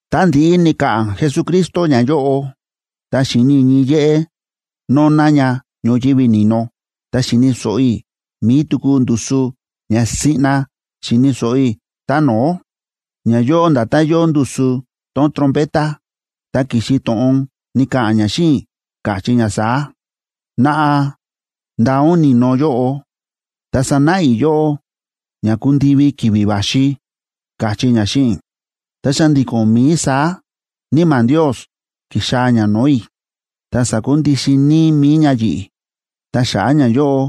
Tá ndi̱ꞌi ni̱ka̱ꞌa̱n Jesucristo ñayóꞌo, ta xi̱ni i̱ ñii yéꞌé nóná ña ñoyívi ni̱no, ta xi̱ni̱ so̱ꞌo i̱ mi̱i tuku ndusu ña siꞌna xi̱ni̱ so̱ꞌo i̱ tá no̱ó, ña yóo nda̱tán yóo ndusu tón trompeta, ta ki̱xi to̱ꞌon ni̱ka̱ꞌa̱n ña xíꞌin i̱, káchí ña saá: ―Naꞌa, ndaa ún ni̱no yóꞌo, ta sanáꞌa i̱ yóꞌó ña kundivi ki̱vi̱ va̱xi ―káchí ña xíꞌin i̱. Ta xa̱ndi̱ko̱n mií saá Níma̱ Ndios ki̱xaa̱ ña no̱o̱ i̱, ta sa̱kundixin níí mi̱i ña yi̱ꞌi̱, ta xa̱ꞌa̱ ñayóꞌo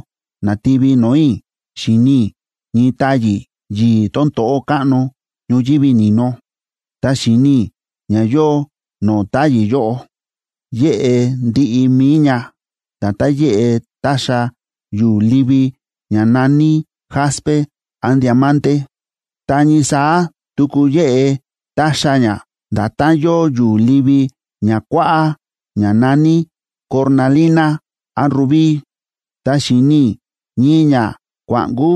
na̱tivi no̱o̱ i̱ xi̱ni i̱ ñii táyi̱ yi̱i̱ tón to̱ꞌó káꞌno ñoyívi ni̱no, ta xi̱ni i̱ ña yóo no̱o̱ táyi̱ yóꞌo. Yéꞌe ndiꞌi mi̱i ña nda̱tán yéꞌe táxa yu̱u̱ livi ña na̱ní jaspe án diamante. Ta ñii saá tuku yéꞌe táxa ña nda̱tán yóo yu̱u̱ livi ña kuáꞌá ña na̱ní cornalina án rubí. Ta xi̱ni i̱ ñii ñakua̱ꞌnkú,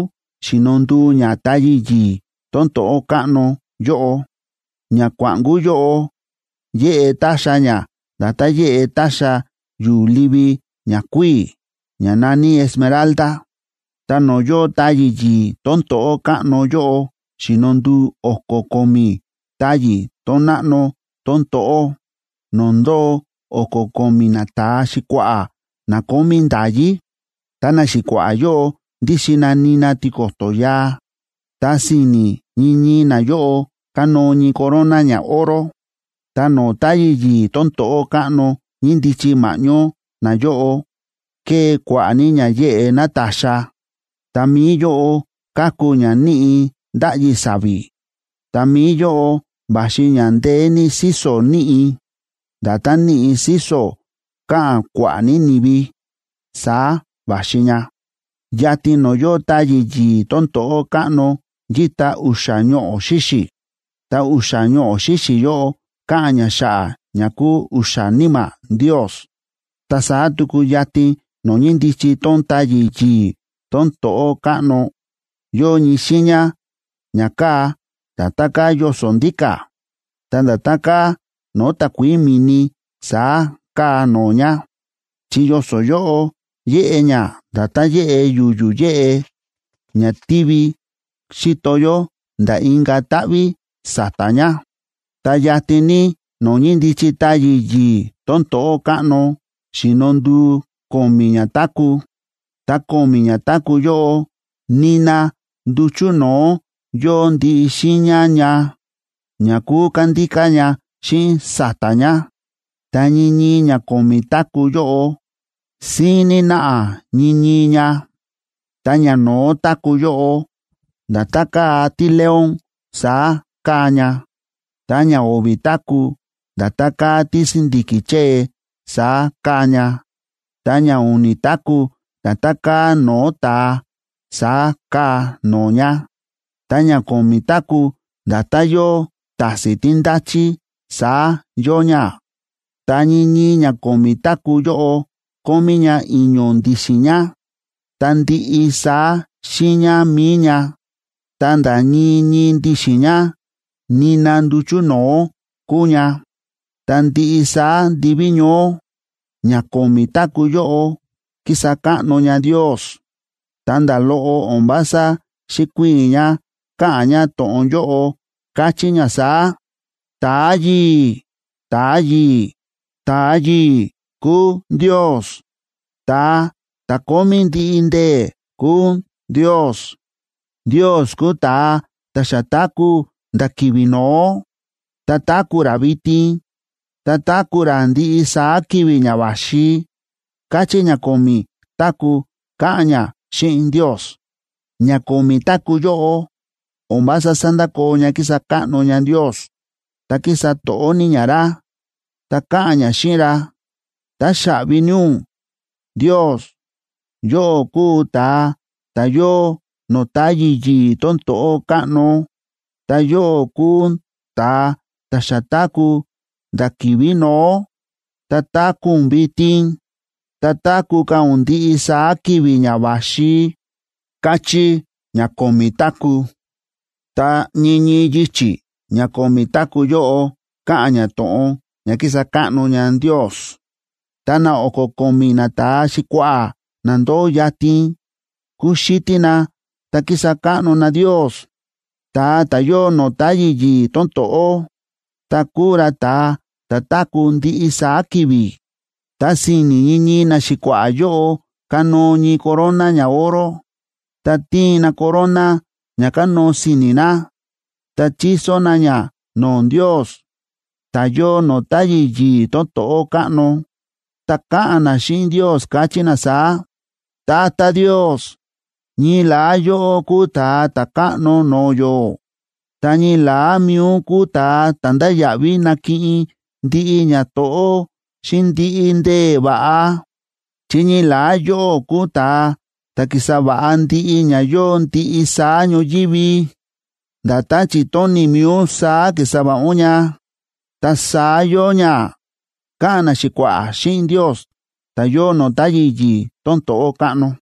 xíno nduu ña táyi̱ yi̱i̱ tón to̱ꞌó káꞌno yóꞌo. Ñakua̱ꞌnkú yóꞌo yéꞌe táxa ña nda̱tán yéꞌe táxa yu̱u̱ livi ña kuíi̱, ña na̱ní esmeralda. Ta no̱o̱ yóo táyi̱ yi̱i̱ tón to̱ꞌó káꞌno yóꞌo xíno nduu o̱ko̱ ko̱mi̱ táyi̱ tón náꞌno tón to̱ꞌó, no̱o̱ ndóo o̱ko̱ ko̱mi̱ nata̱a xi̱kua̱ꞌa̱ na kómí nda̱yí. Ta naxi̱kua̱ꞌa̱ yóꞌo ndíxin na nina tiko̱to̱ yaa, ta si̱ni̱ ñii ñii nayóꞌo kánóo ñii corona ñaoro. Ta no̱o̱ táyi̱ yi̱i̱ tón to̱ꞌó káꞌno ñíndichi ma̱ꞌñó nayóꞌo, ke̱e kua̱ꞌa̱ ní ña yéꞌe nátaxa, ta mi̱i yóꞌo káku ña níꞌi̱ ndáꞌyi sa̱vi̱. Ta mi̱i yóꞌo va̱xi ña ndeé ní síso̱ níꞌi̱. Nda̱tán níꞌi̱ síso̱ káꞌa̱n kua̱ꞌa̱ ní ni̱vi, saá va̱xi ña. Yatin no̱o̱ yóo táyi̱ yi̱i̱ tón to̱ꞌó káꞌno yíta u̱xa̱ ñoꞌo̱ xíxi̱, ta u̱xa̱ ñoꞌo̱ xíxi̱ yóꞌo káꞌa̱n ña xa̱ꞌa̱ ña kúu u̱xa̱ níma̱ Ndios. Ta saá tuku yatin no̱o̱ ñíndichi tón táyi̱ yi̱i̱ tón to̱ꞌó káꞌno, yóo ñii xiiña ña káa nda̱tán káa yoso̱ ndíka̱, ta nda̱tán káa no̱o̱ takuií mi̱ni saá káa no̱o̱ ña, chi yoso̱ yóꞌo yéꞌe ña nda̱tán yéꞌe yu̱yu̱ yéꞌe ña tívi xíto yó nda̱ inka̱ táꞌví sa̱ta̱ ña. Ta yatin ní no̱o̱ ñíndichi táyi̱ yi̱i̱ tón to̱ꞌó káꞌno xi̱no nduu ko̱mi̱ ñatáku̱. Ta ko̱mi̱ ñatáku̱ yóꞌo, nina nduchu̱ no̱o̱ yóo ndiꞌi xiiña ña, ña kúu kándíká ña xíꞌin sa̱ta̱ ña. Ta ñii ñii ña ko̱mi̱ táku̱ yóꞌo, síín ní náꞌa ñii ñii ña. Ta ñano̱ó táku̱ yóꞌo, nda̱tán káa tíleón, saá káa ña. Ta ñao̱vi̱ táku̱, nda̱tán káa tísi̱ndi̱ki̱ chée, saá káa ña. Ta ñau̱ni̱ táku̱, nda̱tán káa no̱o̱ ta̱a, saá káa no̱o̱ ña. Ta ñako̱mi̱ táku̱, nda̱tán yóo ta̱si̱n tí ndáchí, saá yóo ña. Ta ñii ñii ña ko̱mi̱ táku̱ yóꞌo kómí ña i̱ño̱ ndi̱xi̱n ña. Ta ndiꞌi saá xiiña mi̱i ña, ta̱nda̱ ñii ñii ndi̱xi̱n ña, nina nduchu̱ no̱o̱ kúu ña. Ta ndiꞌi saá ndiví ñoó, ña ko̱mi̱ táku̱ yóꞌo kísa káꞌno ña Ndios, ta nda̱ loꞌo o̱n vása xíkuiin ña káꞌa̱n ña to̱ꞌon yóꞌo, káchí ña saá: ¡Ta̱a yi̱i̱, ta̱a yi̱i̱, ta̱a yi̱i̱ kúu Ndios! ¡Ta̱a ta̱ kómí ndiꞌi ndee̱ kúu Ndios! Ndios kúu ta̱a ta̱ xa táku̱ nda̱ ki̱vi̱ no̱ó, ta táku̱ ra vitin, ta táku̱ ra ndiꞌi saá ki̱vi̱ ña va̱xi, káchí ña ko̱mi̱ táku̱, káꞌa̱n ña xíꞌin Ndios. Ña ko̱mi̱ táku̱ yóꞌo o̱n vása sándakoo ña kísa káꞌno ña Ndios, ta kísa to̱ꞌó ní ña ra, ta káꞌa̱n ña xíꞌin ra: “Táxaꞌvi ní ún, Ndios, yóꞌó kúu ún ta̱a ta̱ yóo no̱o̱ táyi̱ yi̱i̱ tón to̱ꞌó káꞌno, ta yóꞌó kúu ún ta̱a ta̱ xa táku̱ nda̱ ki̱vi̱ no̱ó, ta táku̱ ún vitin, ta táku̱ ka̱ ún ndiꞌi saá ki̱vi̱ ña va̱xi”, káchí ña ko̱mi̱ táku̱. Ta ñii ñii yichi̱ ña ko̱mi̱ táku̱ yóꞌo káꞌa̱n ña to̱ꞌon ña kísa káꞌno ña Ndios, ta na o̱ko̱ ko̱mi̱ nata̱a xi̱kua̱ꞌa̱ na ndóo yatin, kúxítí na ta kísa káꞌno na Ndios, ta̱a ta̱ yóo no̱o̱ táyi̱ yi̱i̱ tón to̱ꞌó, ta kúu ra ta̱a ta̱ táku̱ ndiꞌi saá ki̱vi̱. Ta si̱ni̱ ñii ñii naxi̱kua̱ꞌa̱ yóꞌo kánóo ñii corona ñaoro, ta tíin na corona ña kánóo si̱ni̱ na, ta chíso na ña no̱o̱ Ndios, ta̱ yóo no̱o̱ táyi̱ yi̱i̱ tón to̱ꞌó káꞌno, ta káꞌa̱n na xíꞌin Ndios, káchí na saá: Tata Ndios, ñii la̱á yóꞌó kúu Ta̱a Ta̱káꞌno no̱o̱ yó, ta ñii la̱á mi̱i ún kúu ta̱ ndáya̱ꞌví nakiꞌin ndiꞌi ñato̱ꞌó xíꞌin ndiꞌi ndee̱ va̱ꞌa, chi ñii la̱á yóꞌó kúu ta̱a ta̱ ki̱sa va̱ꞌa ndiꞌi ña yóo ndiꞌi saá ñoyívi. Nda̱tán chi̱tóni̱ mi̱i ún saá ki̱sa va̱ꞌa ún ña, ta saá yóo ña, káꞌa̱n naxi̱kua̱ꞌa̱ xíꞌin Ndios ta̱ yóo no̱o̱ táyi̱ yi̱i̱ tón to̱ꞌó káꞌno.